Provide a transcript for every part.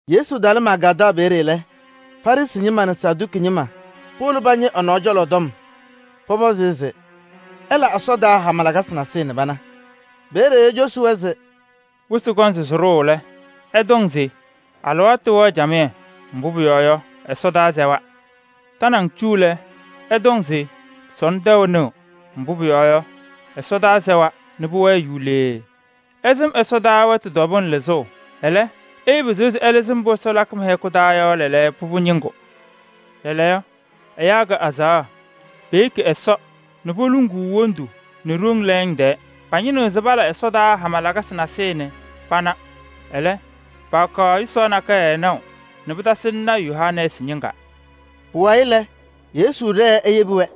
Yesu talɩ Magaadaɣ peeye lɛ, Farɩsɩ ñɩma nɛ Saduki ñɩma powolo pañɩ ɛ-nɔɔ cɔlɔ tɔm. Pɔpɔzɩ-ɩ se ɛla ɛsɔdaa hama lakasɩ nasɩyɩ nɛ pana. Peeye ecosi-wɛ se: [“Wɩsɩ kɔŋ se sɩɖʋʋ lɛ, ɩtɔŋ se: ‘Alɩwaatʋ wɛɣ camɩyɛ, mbʋ pʋyɔɔ yɔ, ɛsɔdaa sɛwa.’ Tanaŋ cu lɛ, ɩtɔŋ se: ‘Sɔnɔ tɛʋ nɩɣ, mbʋ pʋyɔɔ yɔ, ɛsɔdaa sɛwa nɛ pʋwɛɛ yulee.’ Ɩsɩm ɛsɔdaa wɛtʋ tɔbʋʋ lɩzʋʋ, ɛlɛ, ɩɩpɩzɩɣ se ɩlɩzɩ mbʋ Ɛsɔ lakɩ mɩ-hɛkʋ taa lɛɛlɛɛyɔ yɔ pʋbʋ ñɩŋgʋ.] Lɛɛlɛɛyɔ ɛyaa kɛ azaɣa, peyeki Ɛsɔ nɛ poluŋuu lɛɛbʋ tɛɛ. Pañɩnɩɣ se pala ɛsɔdaa hama lakasɩ nasɩyɩ nɛ pana. Ɛlɛ, paakaɣ yʋsaɣ nakɛyɛ naʋ nɛ pɩtasɩnɩ lɔɔyaɣ tʋ Yoonaasɩ ñɩŋga.” Pʋwayɩ lɛ, Yesu ɖɛɛ eyebi-wɛ.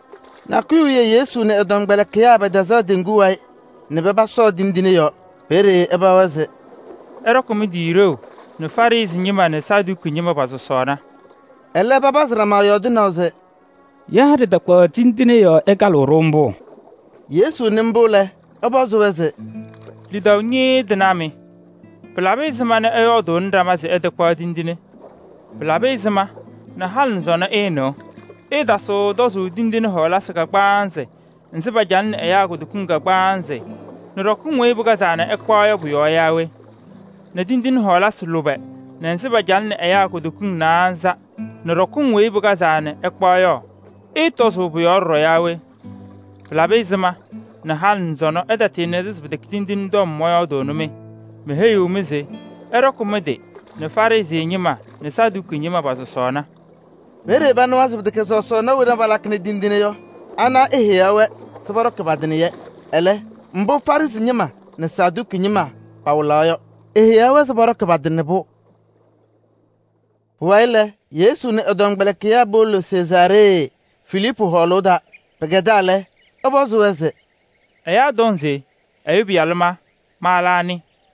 Nakʋyʋ wiye Yesu nɛ ɛ-tɔmkpɛlɩkɩyaa pɛtɛzaɣ teŋgu wayɩ nɛ paba sɔɔ tindine yɔɔ. Peeye ɛpaɣ-wɛ se: “Ɩɖɔkɩ mɩ-tɩ ɖeu nɛ Farɩsɩ ñɩma nɛ Saduki ñɩma pɔ-sɔsɔɔna.” Ɛlɛ papazɩ ɖama yɔɔdɩnaʋ se: “Yaa ɖɩtakpaɣ tindine yɔɔ ɛkalɩɣ-ɖʋ mbʋ?” Yesu nɩ mbʋ lɛ, ɛpɔzɩ-wɛ se: “Lidaʋ ñɩɩɩ tɩnaa mɩ! Pɩlabɩ ɛzɩma nɛ ɩyɔɔdʋʋnɩ ɖama se ɩtakpaɣ tindine? Pɩlabɩ ɛzɩma halɩ nɛ sɔnɔ ɩɩnɩɣ? Ɩɩtasɩɣ tɔzʋʋ tindine kagbaanzɩ wena pacalɩnɩ ɛyaa kutokiŋ kagbaanzɩ nɛ ɖɔkɩŋ weyi pɩkazaa nɛ ɩkpaɣ yɔ pʋ-yɔɔ yaa we? Nɛ tindine lʋbɛ wena nɛ pacalɩnɩ ɛyaa kutokiŋ naanza nɛ ɖɔkɩŋ weyi pɩkazaa nɛ ɩkpaɣ yɔ, ɩɩtɔzʋʋ pʋ-yɔɔ ɖɔɖɔ yaa we? Pɩlabɩ ɛzɩma halɩ nɛ sɔnɔ ɩtatɩɩnɩda se pɩtɛkɛ tindine tɔm mɔyɔɔdaɣnɩ-mɩ? Meheyi-mɩ se ɩɖɔkɩ mɩ-tɩ nɛ Farɩsɩ ñɩma nɛ Saduki ñɩma pɔ-sɔsɔɔna.” Peeye panɩwa se pɩtɛkɛ sɔsɔɔna wena palakɩnɩ tindine yɔ, ana eheyaɣ-wɛ se pɔɖɔkɩ nɛ pa-tɩ. Ɛlɛ, mbʋ Farɩsɩ ñɩma nɛ Saduki ñɩma pawɩlaɣ yɔ, eheyaɣ-wɛ se pɔɖɔkɩ nɛ pa-tɩ. Pʋwayɩ lɛ, Yesu nɛ ɛ-tɔmkpɛlɩkɩyaa powolo Sezaaree Filiipu hɔɔlʋʋ taa. Pɩkɛdaa lɛ, ɛpɔzɩ-wɛ se: “Ɛyaa tɔŋ se Ɛyʋ Pɩyalʋ ma, ma lɛ anɩ?”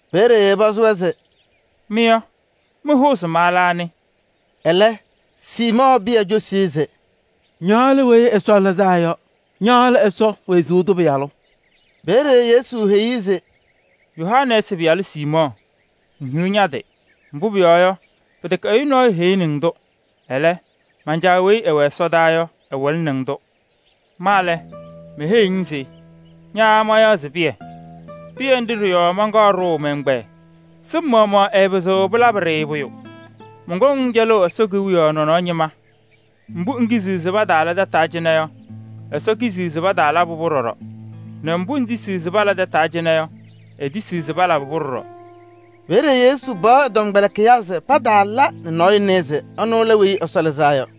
Peeye ɛpɔzɩ-wɛ se: “Mɩ yɔ, mɩhʋʋ se ma lɛ anɩ?” Ɛlɛ, Siimɔɔ Pɩyɛ cosi-i se: “Ña lɛ Weyi Ɛsɔ Lɩzaa Yɔ. Ña lɛ Ɛsɔ wezuu tʋ Pɩyalʋ.” Peeye Yesu heyi-i se: “Yoonaasɩ pɩyalʋ Siimɔɔ! Ŋhiɣ ña-tɩ! Mbʋ pʋyɔɔ yɔ, pɩtɛkɛ ɛyʋ nɔɔyʋ heyini-ŋ-tʋ. Ɛlɛ, man-Caa weyi ɛwɛ ɛsɔdaa yɔ, ɛwɩlɩnɩ-ŋ-tʋ. Ma lɛ, meheyiɣ-ŋ se: ña mayaɣ se Pɩyɛ. Pɩyɛ ndɩ ɖɩ-yɔɔ manɖʋʋ mɛ-ɛgbɛyɛ. Sɩm maɣmaɣ ɛɛpɩzɩɣ pɩlabɩ-ɖɩ pʋyʋ. Mɔnkɔŋ-ŋ cɛlʋʋ Ɛsɔ Kewiyaɣ nɔnɔɔ ñɩma: mbʋ ŋkiziɣ se pataala tataa cɩnɛ yɔ, Ɛsɔ kiziɣ se pataalabɩ-pʋ ɖɔɖɔ, nɛ mbʋ ŋtisiɣ se pala tataa cɩnɛ yɔ, etisiɣ se palabɩ-pʋ ɖɔɖɔ.” Peeye Yesu paɣ ɛ-tɔmkpɛlɩkɩyaa se pataala nɛ nɔɔyʋ nɩɩ se ɛnʋ lɛ Weyi Ɛsɔ Lɩzaa Yɔ.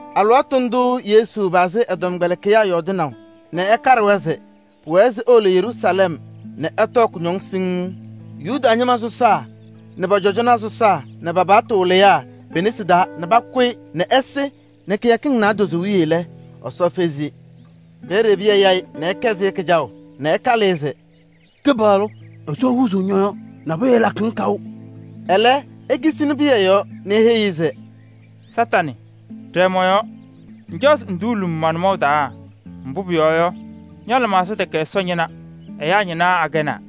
Alɩwaatʋ ndʋʋ Yesu pazɩ ɛ-tɔmkpɛlɩkɩyaa yɔɔdɩnaʋ nɛ ɛkaɖɩ-wɛ se pʋwɛɛ se ewolo Yeruusalɛm nɛ ɛtɔɔ kʋñɔŋ siŋŋ Yuda ñɩma sɔsaa nɛ pɔ-cɔjɔnaa sɔsaa nɛ pa-paɣtʋ wɩlɩyaa pe-nesi taa nɛ pakʋ-ɩ nɛ ɛsɩ nɛ kɩyakɩŋ naadozo wiye lɛ, Ɛsɔ fezi-i. Peeye Pɩyɛ ya-ɩ nɛ ɛkɛsɩ-ɩ kɩjaʋ nɛ ɛkalɩ-ɩ se: “Kɩpaɣlʋ! Ɛsɔ huuzuu ñɔ-yɔɔ. Nabʋyʋ ɛɛlakɩ-ŋ kaʋ!” Ɛlɛ, ekisini Pɩyɛ yɔɔ nɛ eheyi-i se: “Kañadʋ Satanɩ, ɖɛɛ mɔ-yɔɔ! Ŋcaɣ se ŋduuli-m ma-nʋmɔʋ taa. Mbʋ pʋyɔɔ yɔ, ña-lɩmaɣza tɛkɛ Ɛsɔ ñɩna, ɛyaa ñɩna akɛnaa.”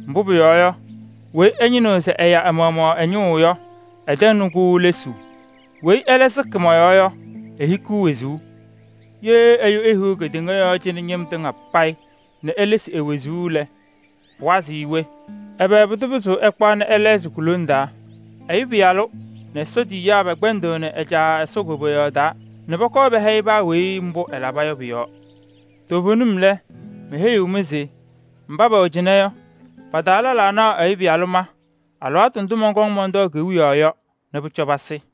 Mbʋ pʋyɔɔ yɔ, weyi ɛñɩnɩɣ se ɛya ɛ-maɣmaɣ ɛ-ñʋʋ yɔ, ɛtɛŋnɩ-kʋ lesuu. Weyi ɛlɛ sɩkɩ mɔ-yɔɔ yɔ, ehikiɣ wezuu. Ye ɛyʋ ehiɣ kedeŋa yɔɔ cɩnɛ ñɩm tɩŋa payɩ nɛ elesi e-wezuu lɛ, pʋwazɩɣ-ɩ we? Ɛbɛ pʋdʋ pɩzɩɣ ɛkpaɣ nɛ ɛlɛɣzɩ ku-lone taa? Ɛyʋ Pɩyalʋ nɛ Ɛsɔ tiyiyaa pɛkpɛndɩɣnɩ ɛ-Caa Ɛsɔ koboyaɣ nɛ pɔkɔɔ nɛ ɛhɛyɩ paa weyi mbʋ ɛlaba yɔ pʋ-yɔɔ. Toovenim lɛ, meheyiɣ-mɩ se: mba pɛwɛ cɩnɛ yɔ, pa-taa lɛlaa naɣ Ɛyʋ Pɩyalʋ ma alɩwaatʋ ndʋ mɔnkɔŋ mɔntɔɔ kewiyaɣ yɔ nɛ pʋcɔ pasɩ.”